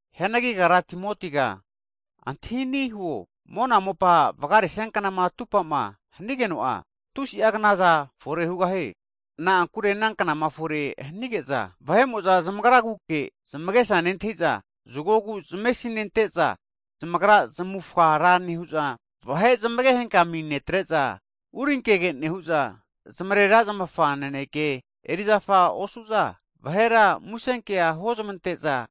Hianagi kagra Timotiga antahi ani' huo, mona mopa vagaresia knama atupa'ma hanigeno'a, tusi'a knaza fore hugahie. Na'ankure ana knama fore hanige'za, vahe'mo'za zamagraguke zamagesa nentahi'za, zagogu zamesinente'za, zamagra zamufga ra nehu'za, vahe zamage henkami netre'za, urinkege nehu'za, zamarera zamafa naneke erizafa osu'za, vahera muse kea huozmante'za,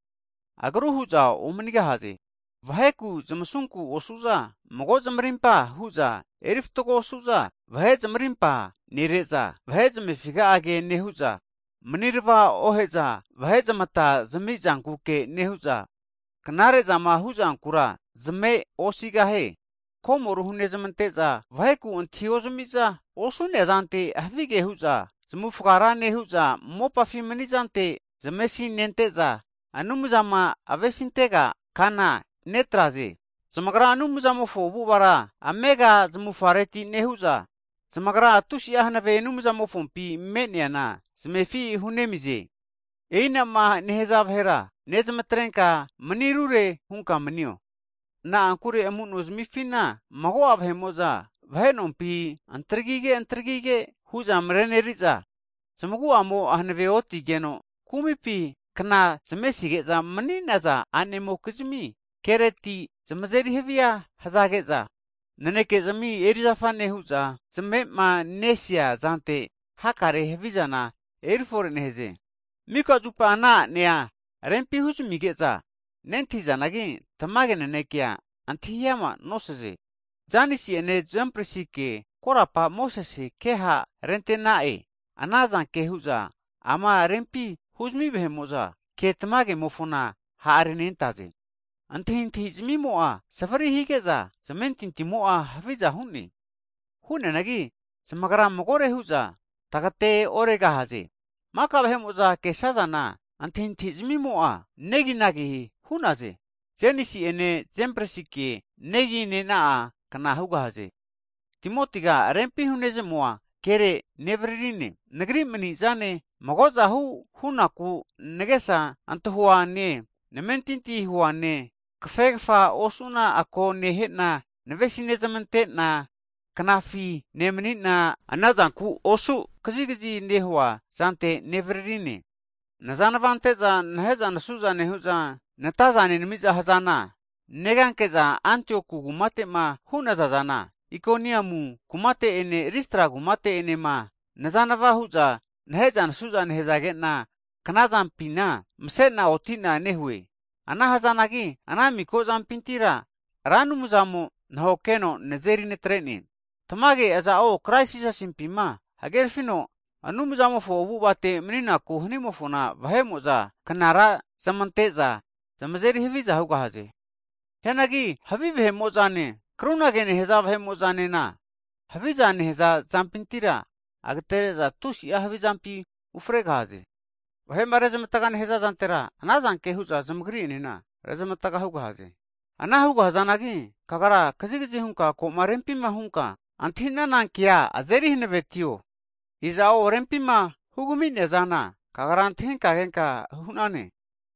agru hu'za omanigahaze. Vaheku zamavesi ozamante'za, kumizmi otrente atrente nosu'za mago zamarimpa hu'za eri fatgo osu'za, vahe zamarimpa nere'za, vahe zamefiga'a ke nehu'za, manirava ohe'za, vahe zamata zamizankuke nehu'za, knare'zama hu'zankura zameosigahie. Hagi vahera komoru (betray) hunezmante'za, vaheku antahiozmi'za, osu'naza zante havige hu'za zmavufga ra nehu'za, mopafi mani'zante zamesinente'za, Anumzama avesi antega kana atregahaze. Zamagra Anumzamofo avu'avara amega zamufareti nehu'za, zamagra tusi'a hanave Anumzamofompi me'neana zamefi hunemize. E'inama nehaza vahera nezmatrenka mani rure hunka manio. Na'ankure amu'nozamifina mago'a vahe'mo'za vahe nompi antagrige antagrige hu'za mareneri'za, zamagu'amo'a hanave otigeno kumipi kna zamesige'za mani'naza a'nemokizmi, kereti zamazeri havia hazage'za, naneke'zmi erizafa nehu'za zamavemanesia zante hakare'a havizana erifore nehaze. Mika zupa ana a'nea rempi huzamige'za nentahizanagi, tamage nanekea antahi ama nosaze. Janesi'ene Jambresikea korapara Mosesena ke ha'rente'na'e, ana zanke hu'za rempi huzmi vahe'mo'za tamage kemofona ha'renentaze. Antahintahi zamimo'a savri higeno, zamentintimo'a haviza hu'ne. Hu'neanagi zamagra magore hu'za tagateoregahaze. Maka vahe'mo'za kesazana antahintahi'zamimo'a neginagi hu'ne. Janesi'ene Jambresike neginena'a kna hugahaze. Hagi Timotiga rempi hunezmua kere nevaririne, nagri mani'zane, mago'za hunaku nagesa antahuane, namentinti huane, kafegafa osu'na ako nehe'na, navesi nezmante'na, knafi nemani'na anazanku osu kazigazi nehuaza hunka nevaririne. Nazanva ante'za nahe'za nazeri haviza nehu'za, nataza nenami'za neganke'za Antioku kumate'ma hu'nazane, Ikonium kumate ene Listra kumate enema, naheza nazeri haviza nehazage'na kna zampina mase'na oti'na nehue. Ana hazanagi ana miko zampintira Ra Anumzamo nahokeheno nazeri natre'ne! Tamage, aza'o Krais Jisasimpi hagerfino Anumzamofo avu'avate mani'naku hanimofona, vahe'mo'za knara zamante'za zamazeri haviza hugahaze. Hianagi havi vahe'mo'zane krunage nehaza vahemo'zanena, haviza nehaza zampintira agtere'za tusi'a havizampi ufregahaze. Vahe'ma rezmatga nehaza'zantera, ana zanke hu'za zamagri'enena rezmatga hugahaze. Ana hugahzanagi kagra, kazigazi hunka ko'ma rempima hunka antahinana kea azeri hanavetio. Tagrama rempima hugami'nonazana kagra antahinka kenka hu'nane.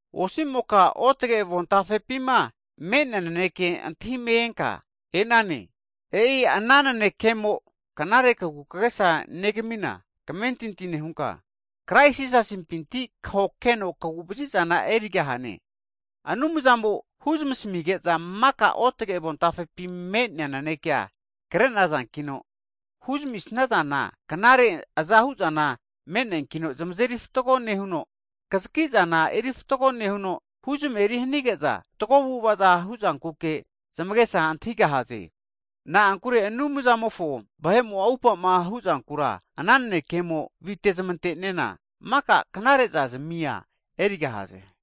Osi'moka otage avontafepima me'nea nanekea antahime enka e'nane, e'i ana nanekemo knare kagukagesa negamina kamentinti nehunka, Krais Jisasipinti kahokeno kagu'vazizana erigahane. Anumzamo huzamasmige'za maka ruotage avontafepi me'nea nanekea kre'nazankino, rempima huzmi'sanana knare azahuzana me'neankino zamazeri fatgo nehuno, kazaki'zana eri fatgo nehuno, huzmeri hanige'za fatgo avu'ava hu'zankuke zamagesa antahigahaze. Na'ankure Anumzamofo vahe'mo'za atupa'ma hu'zankura ana nanekemo vite'zmante'nena, maka knare eri'za zamia erigahaze.